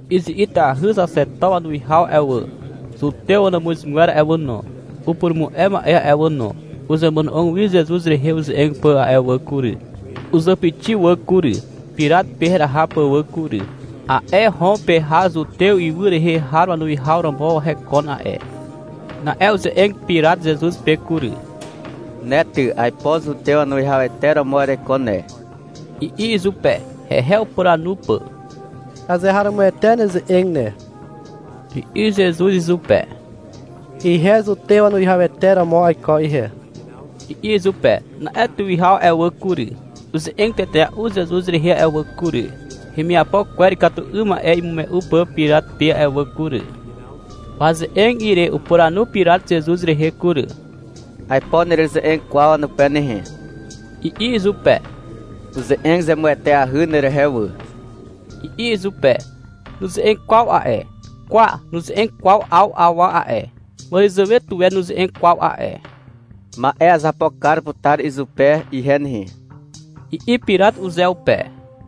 Izi'itahy xaxeto wanuwihaw a'e wà, zutew wanàmuzgwer a'e wà no, upurumu'e ma'e a'e wà no, uzemono'og wi Zezuz rehe uze'eg pà a'e wà kury. Uzàpixi wà kury, Pirat pe heraha pà wà kury. A'e Hom pe har Zutew ywy rehe har wanuwihaw romo hekon a'e. Na'e uze'eg Pirat Zezuz pe kury. — Ne ty, aipo zutew wanuwihawete romo ereiko ne, i'i izupe, hehe upuranu pà. — Azeharomoete neze'eg ne, i'i Zezuz izupe. — Ihe zutew wanuwihawete romo aiko ihe, i'i izupe. Na'e tuwihaw a'e wà kury, uze'eg tetea'u Zezuz rehe a'e wà kury, hemiapo kwer ikatu 'ym ma'e imume'u pà Pirat pe a'e wà kury. Waze'eg ire upuranu Pirat Zezuz rehe kury. — Aipo nereze'eg kwaw wanupe nehe, i'i izupe. — Uze'eg zemueteahy nerehe wà, i'i izupe. Nuze'eg kwaw a'e. — Kwa, nuze'eg kwaw 'aw awa a'e. Màràzàwe tuwe nuze'eg kwaw a'e. Ma'e azapo kar putar izupe ihe nehe, i'i Pirat uzeupe.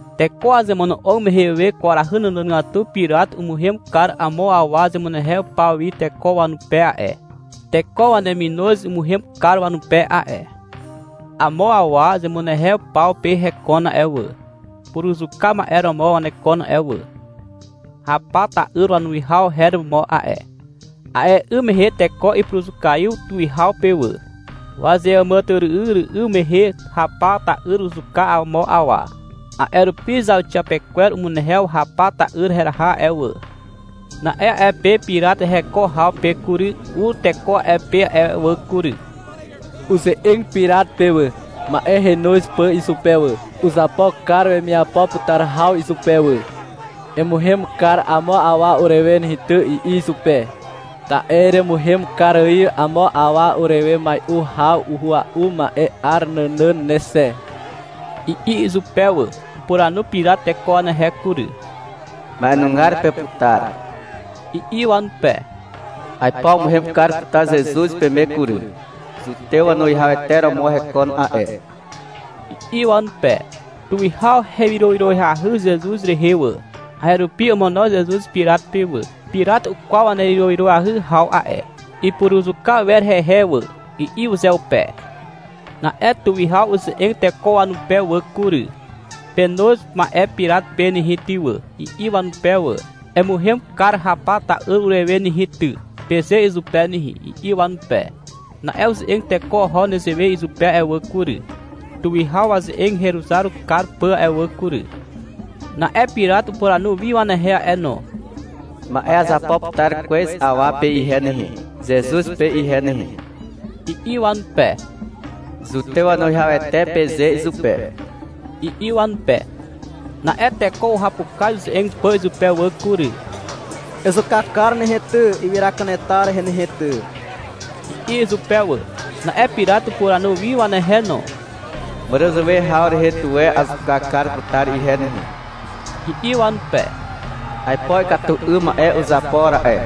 Teko wazemono'og mehe we kwarahy nànàgatu Pirat umuhem kar amo awa zemunehew paw wi teko wanupe a'e. Teko waneminoz umuhem kar wanupe a'e. Amo awa zemunehew paw pe hekon a'e wà. Puruzuka ma'e romo wanekon a'e wà. Hapa ta'yr wanuwihaw her romo a'e. A'e 'ym mehe teko ipuruzukaiw tuwihaw pe wà. Wazeàmàtyry'ym mehe Hapa ta'yr uzuka amo awa. A'e rupi zauxiapekwer umunehew Hapa ta'yr heraha a'e wà. Na'e a'e pe Pirat heko haw pe kury, ur teko a'e pe a'e wà kury. Uze'eg Pirat pe wà, ma'e henoz pà izupe wà. Uzapo kar wemiapo putar haw izupe wà. — Emuhem kar amo awa urewe nehe ty, i'i izupe. — Ta'e eremuhem kar ài amo awa urewe mai'u haw uhua'u ma'e 'ar nànàn ne xe, i'i izupe wà. Upuranu Pirat teko wanehe kury. — Ma'enugar peputar, i'i wanupe. — Aipo amuhem kar putar Zezuz peme kury. Zutew wanuwihawete romo hekon a'e, i'i wanupe. Tuwihaw hewyrowyroahy Zezuz rehe wà. A'e rupi omono Zezuz Pirat pe wà. Pirat ukwaw wanewyroahy haw a'e. — Ipuruzuka wer hehe wà, i'i uzeupe. Na'e tuwihaw uze'eg teko wanupe wà kury. — Penoz ma'e Pirat pe nehe ty wà, i'i wanupe wà. — Emuhem kar Hapa ta'yr urewe nehe ty, peze izupe nehe, i'i wanupe. (Na'e uze'eg teko oho nezewe izupe a'e wà kury, tuwihaw waze'eg heruzar kar pà a'e wà kury.) Na'e Pirat upuranu wi wanehe a'e no. — Ma'e azapo putar kwez awa pe ihe nehe, Zezuz pe ihe nehe, i'i wanupe. — Zutew wanuwihawete, peze izupe, i'i wanupe. Na'e teko uhapukaz uze'eg pà izupe wà kury. — Ezuka kar nehe ty, ywyra kanetar rehe nehe ty, i'i izupe wà. Na'e Pirat upuranu wi wanehe no. — Màràzàwe haw rehe tuwe azuka kar putar ihe nehe, i'i wanupe. — Aipo ikatu 'ym ma'e uzapo ra'e,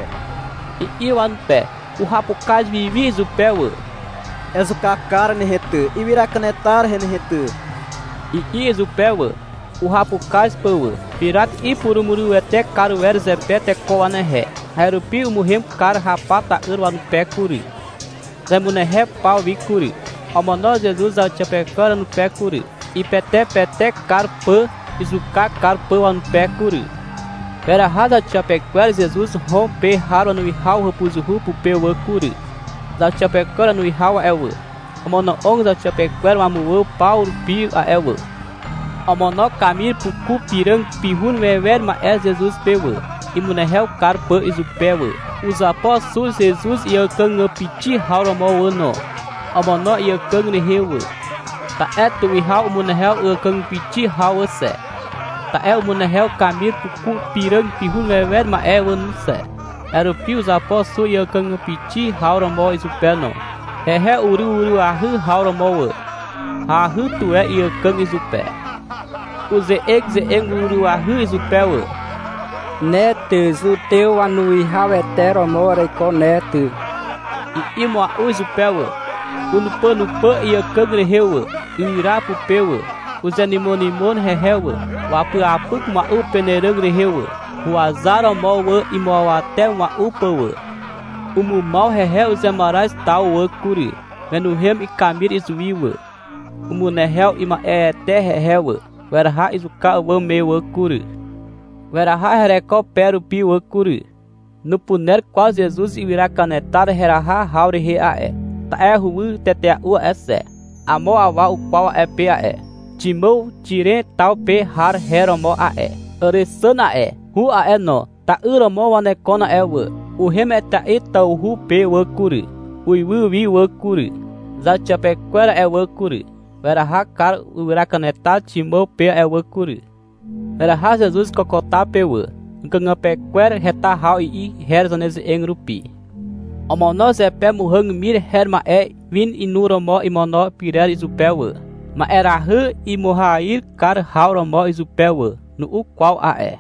i'i wanupe. Uhapukaz wi wi izupe wà. — Ezuka kar nehe ty, ywyra kanetar rehe nehe ty, i'i izupe wà, uhapukaz pà wà. Pirat ipurumurywete kar wer zepe teko wanehe. A'e rupi umuhem kar Hapa ta'yr wanupe kury, zemunehepaw wi kury. Omono Zezuz zauxiapekwer wanupe kury, ipetepetek kar pà izuka kar pà wanupe kury. Weraha zauxiapekwer Zezuz Hom pe har wanuwihaw hàpuzuhu pupe wà kury. Zauxiapekwer wanuwihaw a'e wà, omono'og zauxiapekwer wamuwà paw rupi a'e wà. Omono kamir puku piràg pihun wewer ma'e Zezuz pe wà, imunehew kar pà izupe wà. Uzapo xu Zezuz iàkàgàpixi haw romo wà no. Omono iàkàg rehe wà. Ta'e tuwihaw umunehew àkàgàpixi haw wà xe, ta'e umunehew kamir puku piràg pihun wewer ma'e wà no xe. A'e rupi uzapo xu iàkàgàpixi haw romo izupe no, hehe uryw ahyahy haw romo wà. Hahy tuwe iàkàg izupe. Uze'eze'eg uryw ahyahy izupe wà. — Ne ty, Zutew wanuwihawete romo ereiko ne ty, i'i mua'u izupe wà. Unupànupà iàkàg rehe wà, ywyra pupe wà. Uzenymonymon hehe wà. Wapyapyk mua'u upenàràg rehe wà, huwazaromo wà imuawate mua'u pà wà. Umumaw hehe uzemaraz taw wà kury. Wenuhem ikamir izuwi wà. Umunehew ima'eete hehe wà. Weraha izuka àwàm me wà kury. Weraha hereko pe rupi wà kury. (Nupuner kwaw Zezuz ywyra kanetar heraha haw rehe a'e, ta'e huwy tetea'u a'e xe.) Amo awa ukwaw a'e pe a'e. Ximàw Xiren taw pe har her romo a'e. (Àrexàn a'e, Hu a'e no, ta'yr romo wanekon a'e wà.) Uhem etea'i tawhu pe wà kury, uiwy wi wà kury. Zauxiapekwer a'e wà kury, weraha kar ywyra kanetar Ximàw pe a'e wà kury. Weraha Zezuz Kokota pe wà. Àkàgàpe kwer heta haw i'i her zaneze'eg rupi. Omono zepe muhàg mir her ma'e win inuromo imono pyrer izupe wà, ma'erahy imuahyir kar haw romo izupe wà. Nu'u kwaw a'e.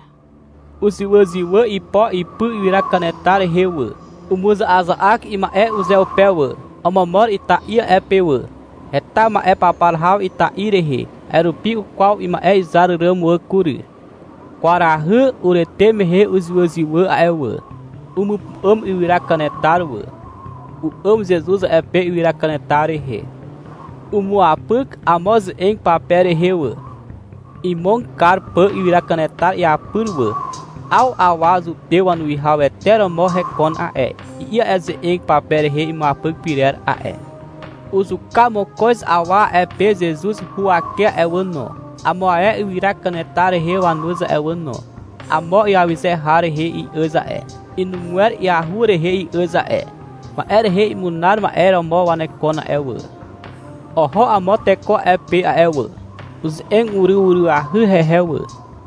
Uzywàzywà ipo ipy ywyra kanetar rehe wà. Umuza'aza'ak ima'e uzeupe wà. Omomor ita'i a'e pe wà. Heta ma'e papar haw ita'i rehe. A'e rupi ukwaw ima'e izar ràm wà kury. Kwarahy urete mehe uzywàzywà a'e wà. Umupu'àm ywyra kanetar wà. U'àm Zezuz a'e pe ywyra kanetar rehe. Umuapyk amo ze'eg pape rehe wà, imog kar pà ywyra kanetar iapyr wà. — 'Aw awa zutew wanuwihawete romo hekon a'e, i'i a'e ze'eg pape rehe imuapyk pyrer a'e. Uzuka mokoz awa a'e pe Zezuz huwake a'e wà no, amo ae ywyra kanetar rehe wanuz a'e wà no. Amo iawyze har rehe i'àz a'e. Inugwer iahur rehe i'àz a'e. Ma'e rehe imunar ma'e romo wanekon a'e wà. Oho amo teko a'e pe a'e wà. Uze'eg uryw ahyahy hehe wà.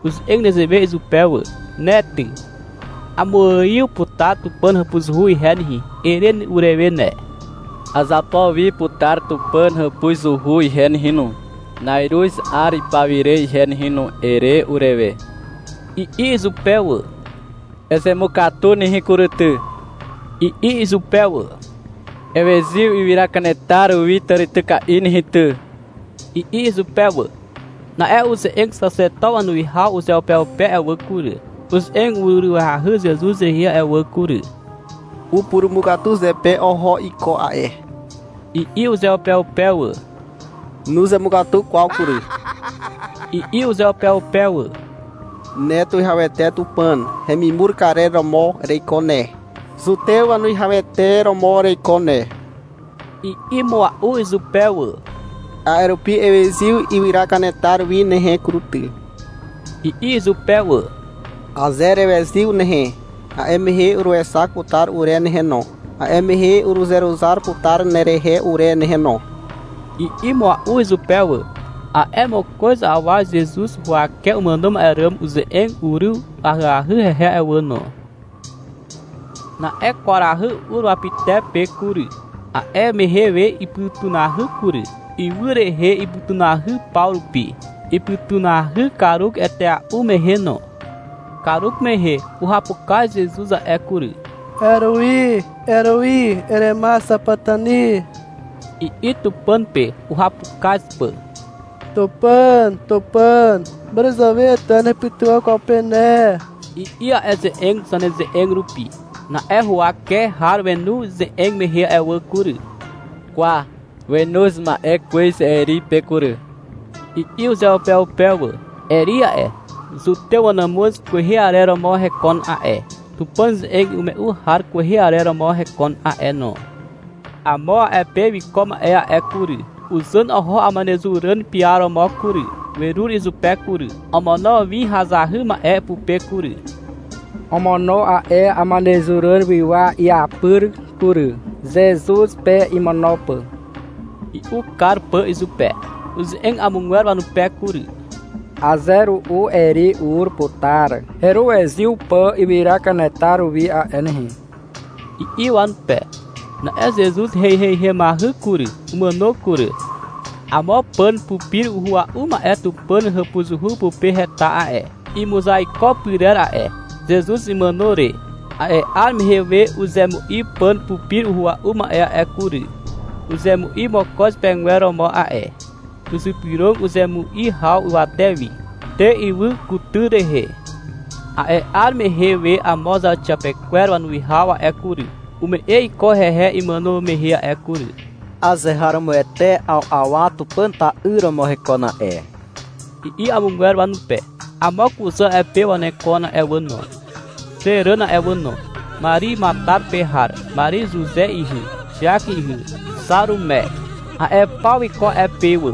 Uze'eg nezewe izupe wà. — Ne ty, — Amuaiw putar Tupàn hàpuzuhu ihe nehe, ere urewe ne. — Azapo wi putar Tupàn hàpuzuhu ihe nehe no, na'iruz 'ar pawire ihe nehe no, ere urewe, i'i izupe wà. — Ezemukatu nehe kury ty, i'i izupe wà. — Ewezyw ywyra kanetar wi tàrityka'i nehe ty, i'i izupe wà. Na'e uze'eg xaxeto wanuwihaw uzeupeupe a'e wà kury, uze'eg uryw ahyahy Zezuz rehe a'e wà kury. — Upurumukatu zepe oho iko a'e, i'i uzeupeupe wà. — Nuzemukatu kwaw kury, i'i uzeupeupe wà. — Ne Tuwihawete Tupàn hemimur karer romo ereiko ne, Zutew wanuwihawete romo ereiko ne, i'i mua'u izupe wà. — A'e rupi ewezyw ywyra kanetar wi nehe kury ty, i'i izupe wà. — Aze erewezyw nehe, a'e mehe uruexak putar ure nehe no, a'e mehe uruzeruzar putar nerehe ure nehe no, i'i mua'u izupe wà. A'e mokoz awa Zezuz huwake umàno ma'e ràm uze'eg uryw ahyahy hehe a'e wà no. Na'e kwarahy ur wapytepe kury. A'e mehe we ipytunahy kury. Ywy rehe ipytunahy paw rupi. Ipytunahy karuk etea'u mehe no. Karuk mehe uhapukaz Zezuz a'e kury. — Erui, Erui, erema xapatani, i'i Tupàn pe, uhapukaz pà. — Tupàn, Tupàn, màràzàwe tuwe nahepytywà kwaw pe ne, i'i a'e ze'eg zaneze'eg rupi. Na'e huwake har wenu ize'eg mehe a'e wà kury. — Kwa, wenoz ma'e kwez Eri pe kury, i'i uzeupeupe wà. Eri a'e, Zutew wanàmuz kwehe arer romo hekon a'e, Tupàn ze'eg imume'u har kwehe arer romo hekon a'e no. Amo a'e pe wiko ma'e a'e kury, uzàn oho amanezuràn piaromo kury. Werur izupe kury. Omono win hazahy ma'e pupe kury. Omono a'e amanezuràn wywa iapyr kury, Zezuz pe imono pà, i'u kar pà izupe. Uze'eg amogwer wanupe kury. — Aze ru'u Eri ur putar heruwezyw pà ywyra kanetar wi a'e nehe, i'i wanupe. Na'e Zezuz heiheihemahy kury. Umàno kury. Amo pàn pupir uhua'u ma'e Tupàn hàpuzuhu pupe heta a'e, imuzaiko pyrer a'e. Zezuz imàno re, a'e 'ar mehe we uzemu'i pàn pupir uhua'u ma'e a'e kury. Uzemu'i mokoz pegwer romo a'e. Uzypyrog uzemu'i haw ywate wi. Te ywy kutyr rehe. A'e 'ar mehe we amo zauxiapekwer wanuwihaw a'e kury, ume'e iko hehe imàno mehe a'e kury. — Azeharomoete, 'aw awa Tupàn ra'yr romo hekon a'e, i'i amogwer wanupe. Amo kuzà a'e pe wanekon a'e wà no, xe ràn a'e wà no. Mari Matar pe har, Mari Zuze ihy, Xiak ihy, Xarume. A'e paw wiko a'e pe wà.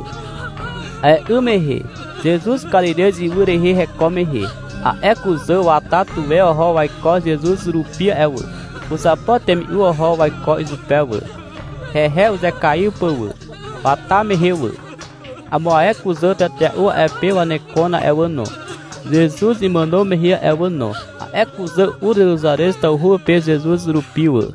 A'e 'ym mehe, Zezuz Karirez ywy rehe heko mehe, a'e kuzà wata tuwe oho waiko Zezuz rupi a'e wà. Uzapo temi'u oho waiko izupe wà, hehe uzekaiw pà wà, wata mehe wà. Amo ae kuzà tetea'u a'e pe wanekon a'e wà no, Zezuz imàno mehe a'e wà no. A'e kuzà ur Zeruzarez tawhu pe Zezuz rupi wà.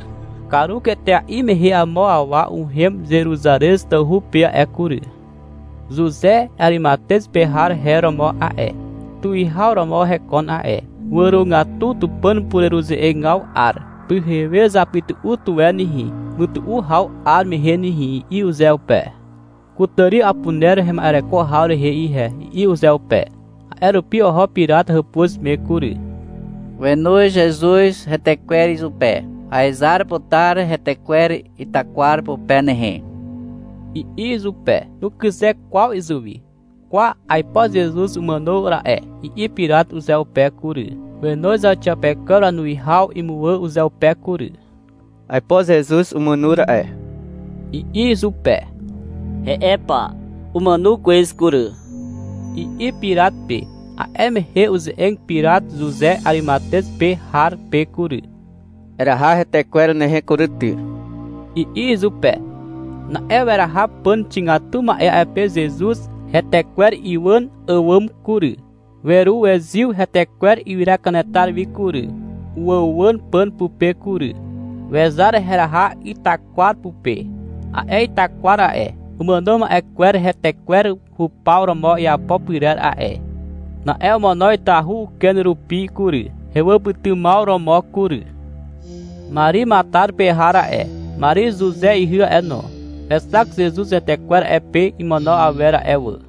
Karuk etea'i mehe amo awa uhem Zeruzarez tawhu pe a'e kury. Zuze Arimatez pe har her romo a'e. Tuwihaw romo hekon a'e. Wàrogatu Tupàn pureruze'egaw 'ar. — Pyhewe zapytu'u tuwe nehe, mytu'u haw 'ar mehe nehe, i'i uzeupe. — Kutàri apuner hema'ereko haw rehe ihe, i'i uzeupe. A'e rupi oho Pirat hàpuz me kury. Wenoz Zezuz hetekwer izupe. — Aezar putar hetekwer itakwar pupe nehe, i'i izupe. Nukyze kwaw izuwi. — Kwa, aipo Zezuz umàno ra'e, i'i Pirat uzeupe kury. Wenoz zauxiapekwer wanuwihaw imuwà uzeupe kury. — Aipo Zezuz umàno ra'e, i'i izupe. — He'e pa, umàno kwez kury, i'i Pirat pe. A'e mehe uze'eg Pirat Zuze Arimatez pe har pe kury. — Eraha hetekwer nehe kury ty, i'i izupe. Na'e weraha pàn xigatu ma'e a'e pe Zezuz hetekwer iwàn àwàm kury. Weruwezyw hetekwer ywyra kanetar wi kury. Uwàuwàn pàn pupe kury. Wezar heraha itakwar pupe. A'e itakwar a'e, umàno ma'e kwer hetekwer hupaw romo iapo pyrer a'e. Na'e omono itahu uken rupi kury, hewàpytymaw romo kury. Mari Matar pe har a'e, Mari Zuze ihy a'e no, wexak Zezuz hetekwer a'e pe imono awer a'e wà.